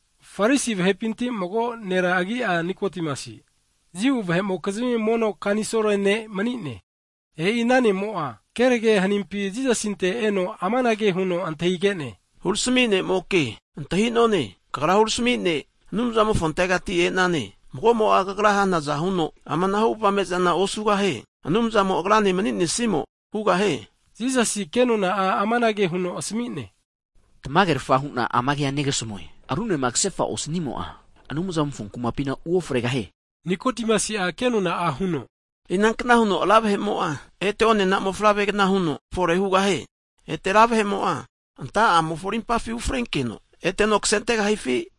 Farisi vahepinti mago nera agi'a Nikodimasi, Jiu vahe'mokizmi mono kanisol ne' mani'ne. E'i ana ne'mo'a kenage hanimpi Jisasinte eno amanage huno antahige'ne. Hurami ne'moka antahi'none, Kagra hurami ne' Anumzamofontegati e'nane. Mago'mo'a Kagra hanaza huno amanahu avame zana osugahie, Anumzamo agrane mani'nesimo hugahie. Jisasi kenona'a amanage huno asmi'ne, tamagerafa hu'na ama kea negasmue. Runema ksefa osnimo'a, Anumzamofo kumapina uofregahie, Nikodimasi'a kenona'a huno, inankna huno ra vahe'mo'a ete osi mofavregna huno fore hugahie? Ete ra vahe'mo'a anta'amofo arimpafi ufrenkeno eteno ksentegahifi?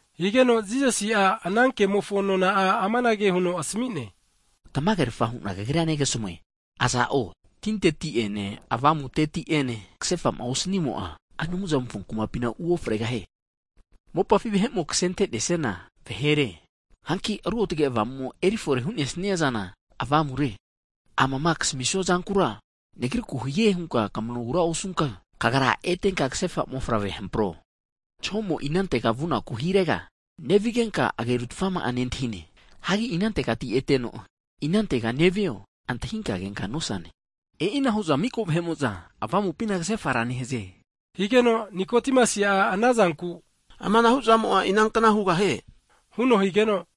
Higeno Jisasi'a ana kemofo nona'a amanage huno asmi'ne, Tamagerafa hu'na kagrira negasmue. Aza'o tinteti'ene Avamuteti'ene ksefa osnimo'a, Anumzamofo kumapina uofregahie, Mopafi vahe'mo ksente'nesiana vahere. Hanki Ruotge Avamu'mo eri fore hu'nesiazana avamure. Amama ksamisua zankura Nagriku hie hunka kmanogura osunka, kagra etenka ksefa mofavre hampro, Zahomo'a inantega vunaku hirega nevigenka agerutfama'a nentahine. Hagi inantegati eteno, inantega nevio antahinka kenka nosane. E'ina hu'za mika vahe'mo'za Avamupina ksefara nehaze. Nikodimasi'a ana zanku, amanahu zamo'a inankna hugahie? huno higeno,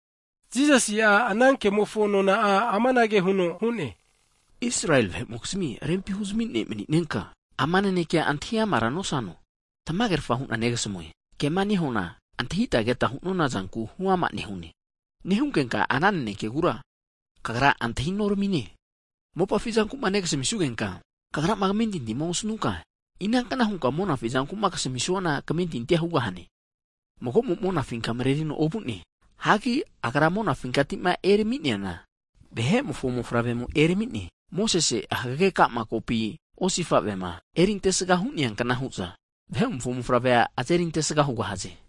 Jisasi'a ana kemofo nona'a amanage huno hu'ne, Israeli vahe'mokizmi rempi huzami ne' mani'nenka, ama nanekea antahi amara nosano? Tmagerfa hu'na negasmue. Kema nehunana, antahita keta hu'nona zanku huama nehunkenka, ana nanekegura kagra antahi noramine. Mopafi zanku'ma negasmi'sugenka kagrama kmentintima osnunka, ina kna hunka monafi zanku'ma kasami'suana kamentintina hugahane? Mago'mo'a monafinka mrerino ovu'ne. Hagi Agra monafinkati'ma erami'neana, Vahe'mofo Mofavremo erami'ne. Mosese hagage kokampi osifa'vema erintesga hu'nea kna hu'za, Vahe'mofo Mofavrea azeri antesga hugahaze.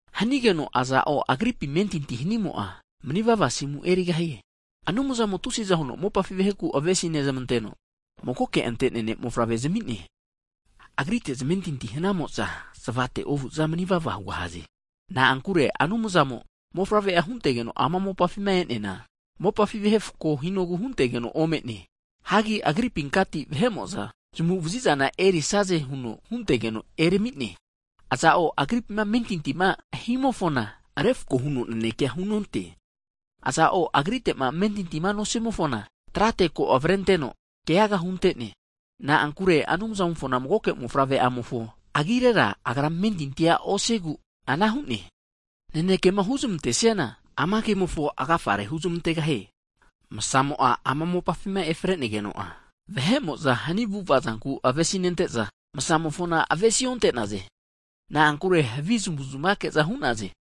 Hanigeno aza'o, Agripi amentinti hanimo'a, manivava asimu erigahie. Anumzamo tusiza huno mopafi vaheku avesi nezmanteno, magoke ante'nea Ne'mofavre'a zami'ne. Agrite zamentinti hanamo'za fananne osu'za manivava hugahaze. Na'ankure Anumzamo Mofavre'a huntegeno ama mopafima e'neana, mopafi vahe refko hinogu huntegeno ome'ne. Hagi Agripinkati vahe'mo'za zamagu'vazizana erisaze huno huntegeno erami'ne. Aza'o Agripitema amentintima himofona refko huno nanekea hunonte, iza'o Agrite'ma amentintima nosimofona, trate ko avrenteno keaga hunte'ne. Na'ankure Anumzamofona magoke Mofavre'amofo agirera, agra amentinti osigu ana nehie. Nanekema huzmante'siana, ama kemofo agafare huzmantegahie. Msamo'a ama mopafima efregeno'a, vahe'mo'za hni avu'ava'zanku avesinente'za msamofona avesi onte'naze. Na'ankure havi zamu'zmake'za hu'naze.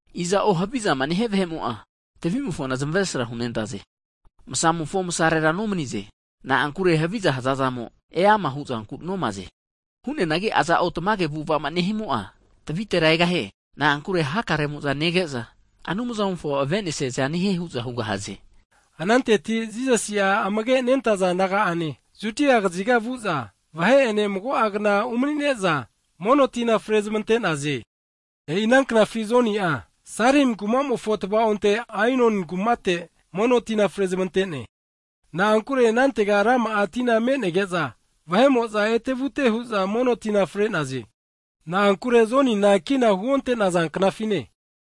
Aza'o hvizama nehia vahe'mo'a, tvi'mofona zamesra hunente'za, msarera nomaze. Na'ankure haviza nehazazamo eama huzanku nomaze. Hu'neanagi aza'o tamage avu'ava'ma nehimo'a tvitera egahie. Na'ankure hakaremo'za nege'za Anumzamofo avenesiaza nehie hu'za hugahaze. Ananteti Jisasi'a amage nentaza disaipol naga'ane, Judia kaziga vu'za vahe'ene mago'a kna umani'ne'za mono tina fre zamante'naze. E'i ana knafi Joni'a, Salim kumamofo tava'onte Ainoni kumate mono tina frezmante'ne. Na'ankure anantega rama'a tina me'nege'za vahe'mo'za ete'vute hu'za mono tina fre'naze. Na'ankure Jonina kina huonte'naza knafine.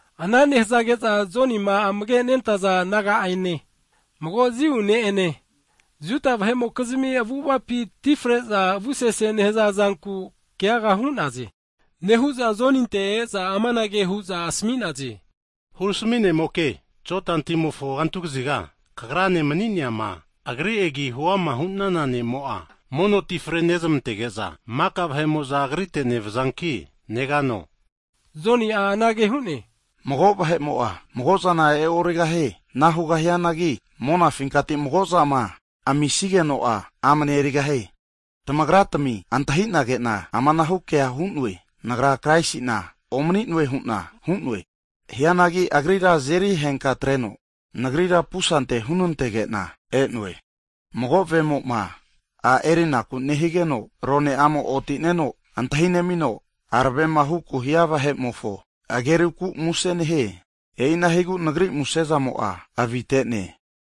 Ana nehzage'za Jonima amage nentaza disaipol naga'ane, mago Jiu ne' ene, Juda vahe'mokizmi avu'avapi ti fre'za avu sese nehaza zanku keaga hu'naze. Nehu'za Joninte e'za amanage hu'za asmi'naze. Hurami (Rabbai) ne'moke, Jodan timofo kantu kaziga kagrane mani'neama, Agri agi hu'ama hu'nana ne'mo'a, mono ti fre nezmantege'za mika vahe'mo'za Agrite nevaze. Joni'a anage hu'ne, mago vahe'mo'a, mago zana e'origahie, ana hugahianagi monafinkati mago'zama amisigeno'a amne erigahie. Tamagra tmi antahi'nage'na amanahu kea hu'noe, Nagra Kraisi'na omni'noe hu'na hu'noe. Hianagi Agrira azeri henka atreno, nagrira pusante hunantege'na e'noe. Mago vemo'ma a'ma erinaku nehigeno rone'amo oti'neno antahi nemino, aravema huku hia vahe'mofo ageruku muse nehie, e'ina higu nagrira muse zamo'a avite'ne.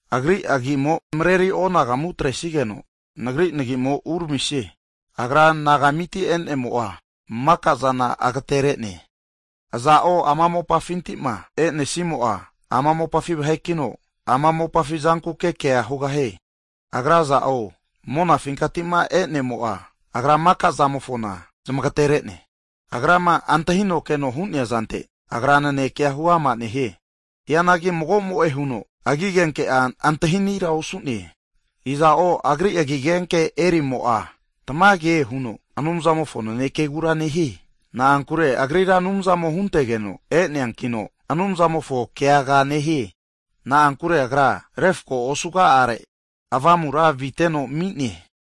Agri agimo mreri anagamu atresigeno, nagri nagimo uramisie. Agra anagamiti e'nemo'a maka'zana agtere'ne, aza'o ama mopafinti'ma e'nesimo'a, ama mopafi vahekino, ama mopafi zankuke kea hugahie. Agra aza'o monafinkati'ma e'nemo'a, Agra maka'zamofona zamagtere'ne. Agrama antahino keno hu'nea zante Agra naneke'a huama nehie, hianagi mago'mo'e huno agi agenke'a antahi anira osu'naze. Iza'o, Agri agi agenke'a erimo'a, tamage huno Anumzamofo nanekegura nehie. Na'ankure Agrira Anumzamo huntege'no e'neankino, Anumzamofo keaga nehie. Na'ankure Agra refko osuga'are Avamura aviteno ami'ne.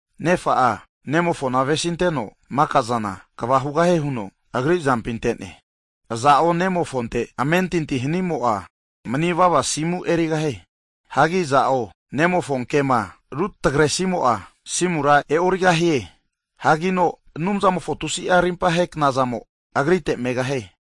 Nefa'a, Nemofona avesinteno mika'zana kva hugahie huno, Agri azampi ante'ne. Aza'o Nemofonte amentinti hanimo'a manivava asimu erigahie. Hagi iza'o Nemofo kema rutagresimo'a asimura e'origahie. Hanki Anumzamofo tusi'a rimpahe knazamo agrite megahie.